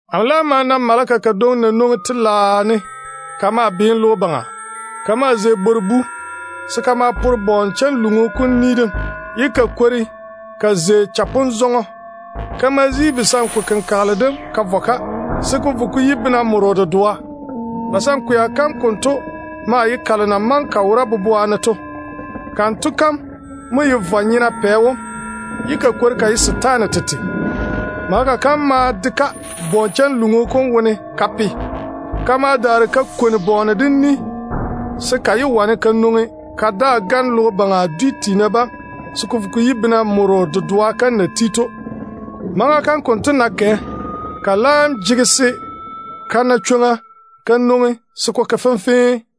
Amo laam ma na maleka kadwoŋi na nwoŋi telaao ne ka maa tu logo baŋa. Ka maa zei bwor-bu se ka ma pore gwoŋ-chanluŋu kom ni dem, ye ka kwori ka zei chapon-zɔŋɔ. Ka ma zi kayanchɔrɔ kom ka vɔ taa, se ko vo ko yi bena moro dedoa. Kayanchɔrɔ kom konto maa ye basankwea kalo na maŋe ka wora faŋa faŋa to. Kanto kam mo ye vwa-nyena pɛ wom, ye ka kwori ka ye setaane tete. Maleka kam ma de-ka gwoŋ-chanluŋu kom wone ka pe. Ka ma daare ka kwoni bɔɔne dem ni se ka yé wane ka nwoŋi ka daa gane logo baŋa dwi tiina bam se ko vo ko yi bena moro kom na wó ti to. Maŋa kam kanto ná kɛ, ko laam jege se ba bwoli-ka ba yage se ko ke fenfee.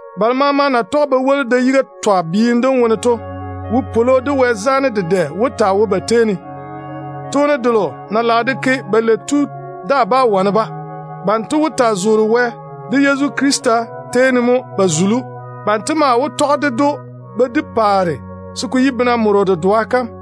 Balo maama na tɔge ba woli da-yiga twa biim dem wone to jege yu-ywoŋo, ba na ye Wɛ tete nɔɔna to ŋwaane. Toone delo na lage de ke belei to daa bá wane-ba. Banto wó taa zege Baŋa Wɛ de Yezu Krista yiga ne mo ba pa zula ne kaanem tiina tei. Ba maa wó tɔge ded‑o ba di paare se ko yi bena moro kom.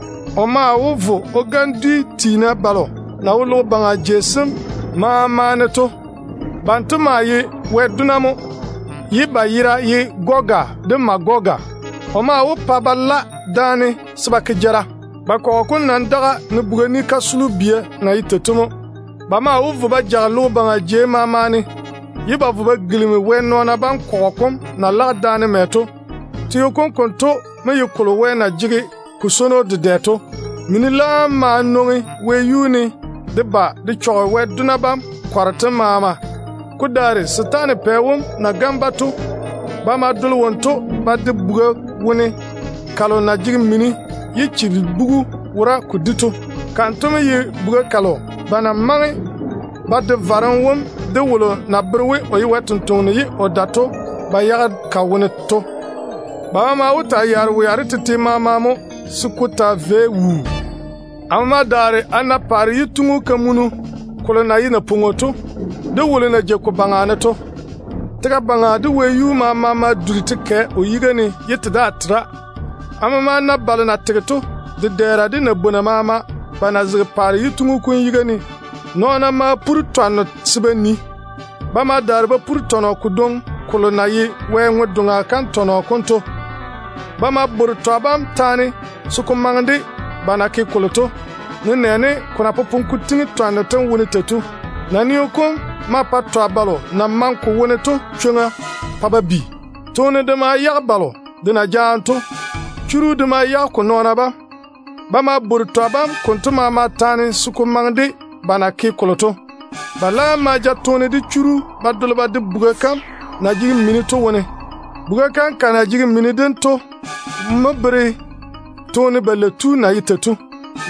O maa wó vo o gane dwi tiina balo na wo logo baŋa jei sem maama ne to. Banto maa ye Wɛ dona mo, ye ba yera ye ‘Goga’ de ‘Magoga’. O maa wó pa ba la daane se ba ke jara. Ba kɔgɔ kom nɔn-bia wó taa daga dedɛ, ne buga ni kasolo bia na ye tei to mo. Ba maa wó tɔge logo baŋa jei maama ba vo ba gilimi Wɛ nɔɔna bam kɔgɔ kom na lage daane mɛ to. Teo kom konto mo ye kolo Wɛ na swoi dedɛ to. Mini laam ma nwoŋi wɛyuu ne de ba de chɔge Wɛ dona bam kɔgɔ kom maama. Ko daare setaana pɛ wom na gane-ba to, ba ma dole wonto ba de buga kalo na jege mini ye chilibugu wora ko di to wone. Kanto mo ye buga kalo ba na maŋe ba de varem wom de wolo na bere we o ye Wɛ sampwora ye o gane nɔɔna to ba yage ka wone to. Dáane mo ba maama wó na cham wea de tete maama se ko taa vei wuu. Amo ma daare a na paare yituŋ-kamunu kolo na ye napwoŋo to, de wolo na jei ko baŋa ne to. Tega baŋa de wɛyuu maama ma duri te kɛ o yiga ne, ye te daa tera. Amo ma na balo na tege to, dedɛɛra de nabwona maama, ba zege paare yituŋu kom yiga ne. Nɔɔna ma puri twanno se ba nii. Ba ma daare ba puri tɔnɔ kodwoŋi na ye Wɛ ŋwe-doŋa tɔnɔ kom to. Ba ma bore twa bam taane se ko maŋe de ba na ke kolo to, nenɛɛne ko na popone ko tiŋi twanno tem wone tei to. Naneo kom ma pa twa balo na maŋe ko wone to chwoŋa se ba nwoŋi. Toone de ma yage balo de na jaane to. Churu de ma yage ko nɔɔna bam. Ba ma bore twa bam konto maama taane se ko maŋe de ba na ke kolo to. Ba laam ma ja Toone de Churu ba dole ba de buga kam na jege mini to wone. Buga kam de ka mini dem mo bere toone belei tu na ye tei to.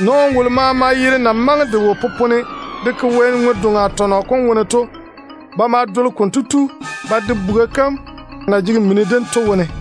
Nɔɔno wolo maama yere na maŋe de wo popone de ke Wɛ ŋwe-doŋa tɔnɔ kom wone to, ba dole konto tu ba de buga kam na jege mini dem to wone mo.